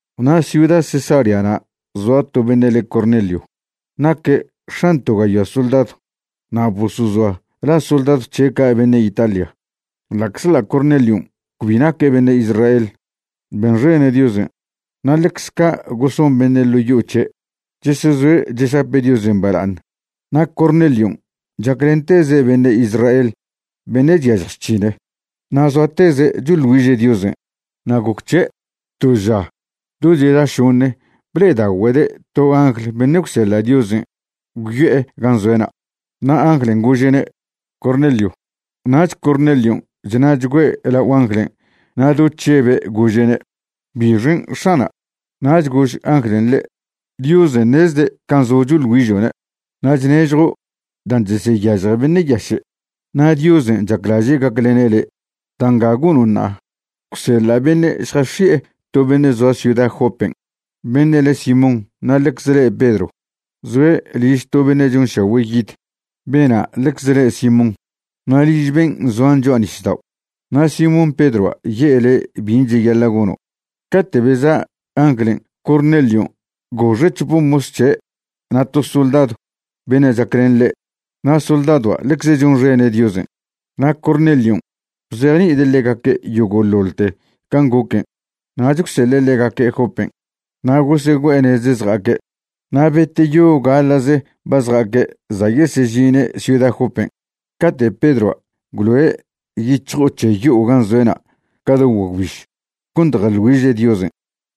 Na' ciuda Cesareana' zoa to beṉe' le Cornelio, naque' x̱an to gayoa soldadw, na' bosozoa la soldadw c̱he' ca' Beṉe' Italia. Ḻa'czḻa' Cornelion' cbi naque' beṉe' Israel, benxene' Diosen', na' ḻecze ca' goson beṉe' ḻo' yo'o c̱he', chesezoe' chesape' Diosen' bala'aṉ. Na' Cornelion' chaclenteze' beṉe' Israel beṉe' chyažj chc̱hine', na' zoateze' choḻ güiže' Diosen'. Na' goc c̱he', to ža do cheda šoṉe ble'edagüede' to angl beṉe' gwseḻa' Diosen' gwyo'e gan' zoe'na', na' anglen' gože'ne': ―Cornelio. Nach Cornelion' chṉa'chgüe' lao anglen' na' do chžebe' gože'ne': ―¿Bixen' X̱ana'? Nach gož anglen' ḻe': ―Diosen' ṉezde' can' zo' choḻ güižo'ne' na' chnežjo' dan' cheseyažje beṉe' yaše', na' Diosen' chaclaže' gaclene' le'. Da' nga gono' ṉa'a, gwseḻa' beṉe' šjasexi'e to beṉe' zoa ciuda Jopen' beṉe' le Simón na' ḻecze le' Pedro. Zoe' liž to beṉe' chonšagüe' yid. Bena' ḻecze le' Simón, na' liž ben' zoan cho'a nisdao'. Na' Simón Pedroa' ye'e le' bin' cheyaḻa' gono'. Cate' beza' anglen' Cornelion' goxe' c̱hope mos c̱he' na' to soldadw beṉe' chaclen ḻe', na' soldadoa' ḻecze chonxene' Diosen'. Na' Cornelion' bzejni'ide' ḻegaque' yogo'ḻoḻte can' goquen' nach gwseḻe' ḻegaque' Jopen'. Na' gosegüe'e nez zja'aque'. Na' beteyo gaḻa'ze ba zja'aque' za' yesežine' ciuda Jopen' cate' Pedroa' gwloe' yic̱hjo'o c̱he yo'o gan' zoe'na' ca do guagwbiž cont jeḻ güiže' Diosen'.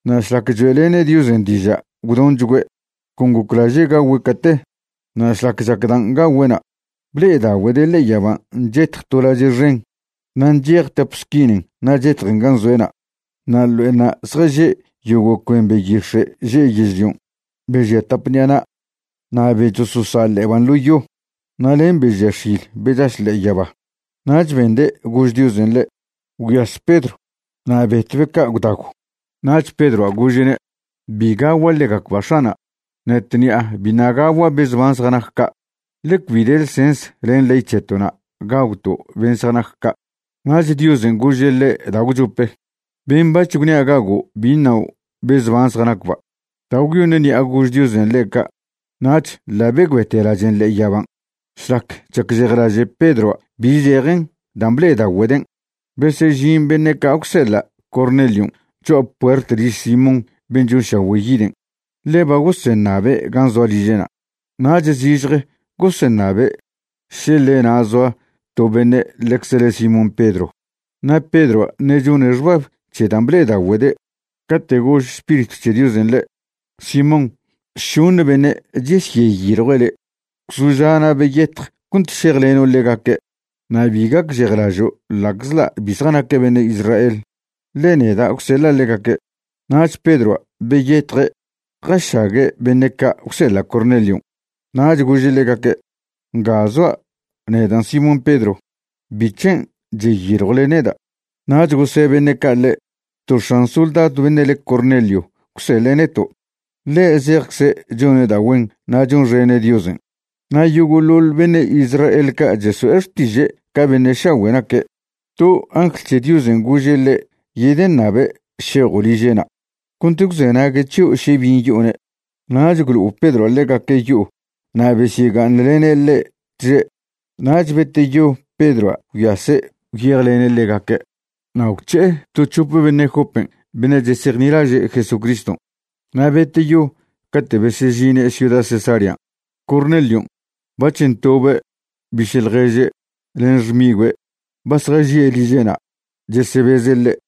Na' šlac choe'lene' Diosen' diža' gwdonchgüe', con goclaže' gagüe' cate. Na' šlac chac dan' gagüe'na', ble'edagüede' ḻe'e yaban' chetj to lache' xen na' nchej tap squinen na' chetjen gan' zoe'na'. Na' ḻo'enṉa' zjaže' yogo' cuen beyix̱e' že' yežlion', be žia tap ṉi'a na', na' be chososa' ḻe'eban' ḻo yo, na' len be žia x̱il be chaš ḻe'e yaba. Nach bende' gož Diosen' ḻe': ―Gwyas Pedro na' betw be ca' gwdagw. Nach Pedroa' gože'ne': ―Bi gagua' ḻegacba' X̱ana'. Ṉe tṉi'a biṉa' gagua' be zban zjanac ca', ḻe cbi de ḻsens len ley c̱heto'na' gagwto' ben' zjanac ca'. Nach Diosen' gože' ḻe' da' gwchope: ―Ben' bac̱h gwnia' gago' bi ṉao' be zban zjanacba'. Da' gwyoṉ ṉi'a gož Diosen' ḻe' ca' nach ḻa' begüete lachen' ḻe'e yaban'. Šlac chacžejlaže' Pedroa' bi zejen dan' ble'edagüeden', besežin beṉe' ca' gwseḻa' Cornelion' cho'a puert liž Simón ben' chonšagüe' yiden', ḻe ba goseṉabe' gan' zoa liže'na'. Nach zižje goseṉabe' še ḻe na' zoa to beṉe' ḻecze le Simón Pedro. Na' Pedroa' ṉe' chone' xbab c̱he dan' ble'edagüede', cate' gož Spiritw c̱he Diosen' ḻe': ―Simón, šoṉe beṉe' chesyeyiljue' le'. Gwzoža' na' beyetj cont šejleno' ḻegaque', na' bi gacžejlažo' ḻa'czḻa' bi zjanaque' beṉe' Israel, ḻe neda' gwseḻa' ḻegaque'. Nach Pedroa' beyetje' jašague' beṉe' ca' gwseḻa' Cornelion', nach gože' ḻegaque': ―Nga zoa', nedan' Simón Pedro. ¿Bic̱hen' cheyiljwle neda'? Nach gose' beṉe' ca' ḻe': ―To x̱an soldadw beṉe' le Cornelio gwseḻe' neto'. Ḻe' zejcze' chone' da' güen na' chonxene' Diosen' na' yogo'ḻoḻ beṉe' Israel ca' cheso'e xtiže' ca beṉe' šagüe' naque'. To angl c̱he Diosen' gože' ḻe' yedeṉabe' šejo' liže'na' cont gwzenague' c̱hio' še bin' yo'one'. Nach gwlo'o Pedroa' ḻegaque' yo'o na' besyega'aṉlene' ḻe' tže'. Nach beteyo Pedroa' gwyase' gwyejlene' ḻegaque' na' gwc̱he'e to c̱hope beṉe' Jopen' beṉe' chesejnilaže' Jesucriston'. Na' beteyo cate' besežine' ciuda Cesarean', Cornelion' bac̱h ntobe' biše' ḻježe' len xmigüe' ba zjažie' liže'na' chesebeze' ḻe'.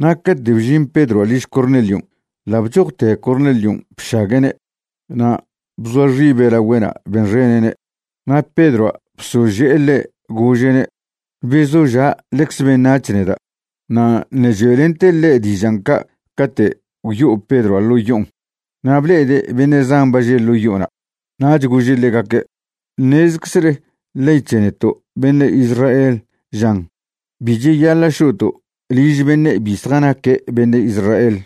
Na' cate' bžin Pedroa' liž Cornelion' ḻa' bchojte Cornelion' bšague'ne' na' bzoa xibe' lagüe'na' benxene'ne'. Na' Pedroa' bsože'e ḻe', gože'ne': ―Bezoža'. Ḻecze beṉac̱h neda'. Na' ṉe' choe'lente' ḻe' dižan' ca' cate' gwyo'o Pedroa' ḻo' yo'on na' ble'ede' beṉe' zan ba že' ḻo yo'ona'. Nach gože' ḻegaque': ―Ṉezeczele ley c̱he neto' beṉe' Israel žan bi cheyaḻa' šo'to' liž beṉe' bi zjanaque' beṉe' Israel,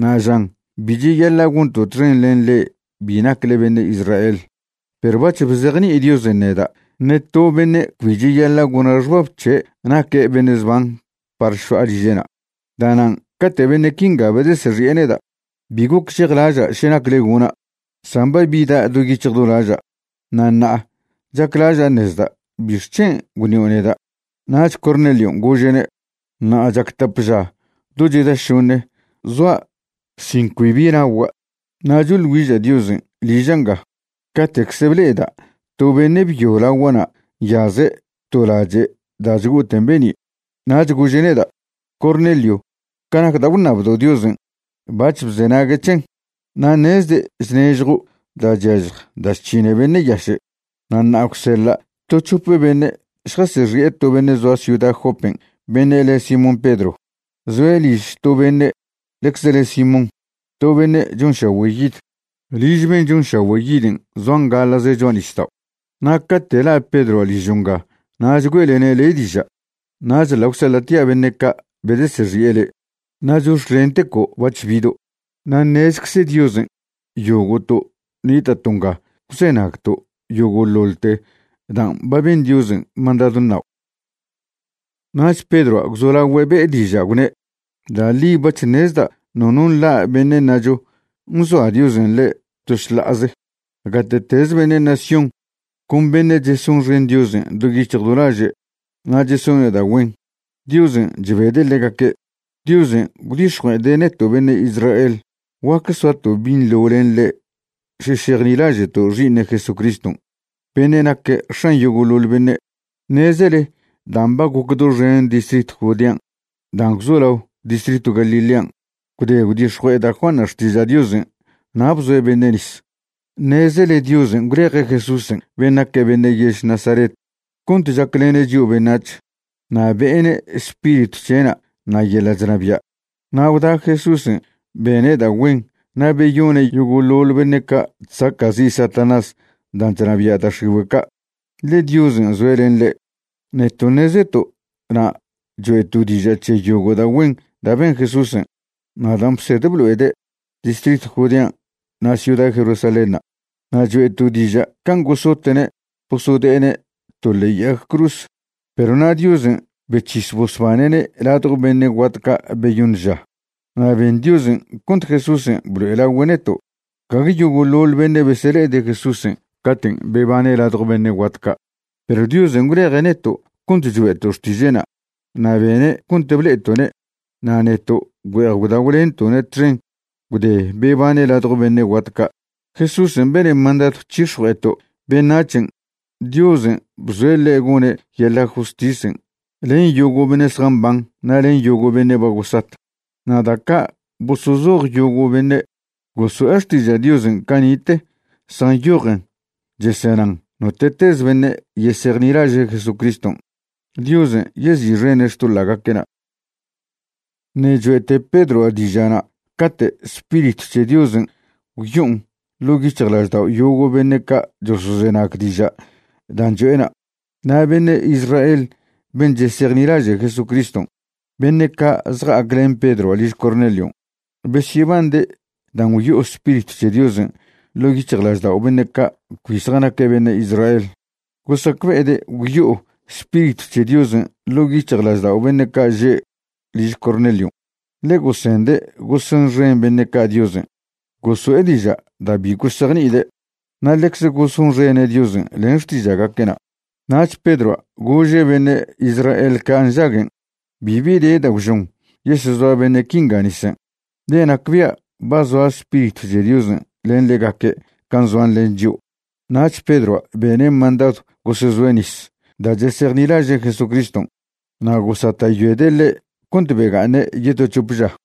na' žan bi cheyaḻa' gonto' txen len le'e bi nacle beṉe' Israel. Perw bac̱h bzejni'i Diosen' neda' ṉe to beṉe' cbi cheyaḻa' gona' xbab c̱he' naque' beṉe' zban par šo'a liže'na'. Da'nan' cate' beṉe' quinga bedesexi'e neda', bi gocžejlaža' še nacle gona', san ba bida' do yic̱hj do laža', na' ṉa'a chaclaža' ṉezda' ¿bixc̱hen' gwṉio' neda'? Nach Cornelion' gože'ne': ―Ṉa'a chac tap ža do cheda šoṉe zoa' sin cbibi nagua', na' choḻ güiža' Diosen' liža' nga, cate'cze ble'eda' to beṉe' byo lagua'na' nyaze' to lache' da' chgo'oten be'ni'. Nach gože' neda': “Cornelio, ca nac da' gwṉabdo' Diosen', bac̱h bzenague' c̱hen, na' ṉezde' chnežjo' da' chyažj da' chc̱hine' beṉe' yaše'. Na' ṉa'a gwseḻa' to c̱hope beṉe' šjasexi'e to beṉe' zoa ciuda Jopen' beṉe' le Simón Pedro. Zoe' liž to beṉe' ḻecze le Simón, to beṉe' chonšagüe' yid. Liž ben' chonšagüe' yiden' zoan gaḻa'ze cho'a nisdao'. Na' cate' la' Pedroa' ližo' nga nach güe'lene' le' diža'.” Nach ḻa' gwseḻa'tia' beṉe' ca' bedesexi'e le', na' chox̱clenteco' bac̱h bido'. Na' ṉezcze Diosen' yogo'to' nita'to' nga gwzenagto' yogo'ḻoḻte dan' ba ben Diosen' mandadw ṉao'. Nach Pedroa' gwzolagüe' be'e dižan' gwne': ―Da' ḻi bac̱h ṉezda' nono nḻa' beṉe' ṉacho nzoa Diosen' ḻe' to šḻa'aze. Gate'teze beṉe' nación con beṉe' chesonxen Diosen' do yic̱hj do laže' na' chesone' da' güen, Diosen' chbede' ḻegaque'. Diosen' gwdix̱jue'ede' neto' beṉe' Israel guac soato' binḻo len ḻe' še šejnilaže'to' Xi'iṉe' Jesucriston' beṉe' naque' X̱an yogo'ḻoḻ beṉe'. Ṉezele dan' ba goc doxen distritw Judean' dan' gwzolao distritw Galilean' gwde gwdix̱jue'e da' Juanṉa' xtiža' Diosen' na' bzoe' beṉe' nis. Ṉezele Diosen' gwleje' Jesúsen' ben' naque' beṉe' yež Nazaret cont chaclene' chio' beṉac̱h, na' be'ene' Spiritw c̱he'na' na' yeḻa' chnabia'. Na' gwda Jesúsen' bene' da' güen na' beyone' yogo'ḻoḻ beṉe' ca' chsaca'zi' Satanás dan' chnabia' da' x̱igüe' ca', ḻe Diosen' zoe' len ḻe'. Neto' ṉezeto' na' choe'to' diža' c̱he yogo' da' güen da' ben Jesúsen' na' dan' bsed blo'ede' distritw Judean' na' ciuda Jerusalénṉa'. Na' choe'to' diža' can' gosote'ne' bosode'ene' to ḻe'e yag cruz. Perw na' Diosen' bec̱his bosbane'ne' ladjo beṉe' guat ca' beyoṉ ža na' ben Diosen' cont Jesúsen' blo'elagüe' neto'. Gague yogo'ḻoḻ beṉe' besele'ede' Jesúsen' caten' bebane' ladjo beṉe' guat ca', perw Diosen' gwleje' neto' cont choe'to' xtiže'na' na' bene' cont ble'eto'ne'. Na' neto' güe'ej gwdagwlento'ne' txen gwde bebane' ladjo beṉe' guat ca'. Jesúsen' bene' mandadw c̱hix̱jue'eto' beṉac̱hen' Diosen' bzoe' ḻe' gone' yeḻa' justisen' len yogo' beṉe' zjamban na' len yogo' beṉe' ba gosat. Na' da' ca' bosozoj yogo' beṉe' goso'e xtiža' Diosen' cani'te zjanyojen chesenan note'tez beṉe' yesejnilaže' Jesucriston', Diosen' yezi'xene' xtoḻa'gaque'na'. Ṉe' cho'ete Pedroa' diža'na' cate' Spiritw c̱he Diosen' gwyo'on ḻo' yic̱hjlaždao' yogo' beṉe' ca' chosozenag diža' dan' cho'ena'. Na' beṉe' Israel ben' chesejnilaže' Jesucriston', beṉe' ca' zja'ac len Pedroa' liž Cornelion', besyebande' dan' gwyo'o Spiritw c̱he Diosen' ḻo' yic̱hjlaždao' beṉe' ca' cbi zjanaque' beṉe' Israel. Gosacbe'ede' gwyo'o Spiritw c̱he Diosen' ḻo' yic̱hjlaždao' beṉe' ca' že' liž Cornelion', ḻe gosende' gosonxen beṉe' ca' Diosen' goso'e diža' da' bi gosejni'ide' na' ḻecze gosonxene' Diosen' len xtiža'gaque'na'. Nach Pedroa' gože' beṉe' Israel ca' nžaguen': ―Bibi de da' gwžon yesezoa beṉe' quinga nisen', ḻe nacbia' ba zoa Spiritw c̱he Diosen' len ḻegaque' can' zoan len chio'. Nach Pedroa' bene' mandadw gosezoe' nis da' chesejnilaže' Jesucriston'. Na' gosata'yoede' ḻe' cont bega'aṉe' yeto c̱hop ža.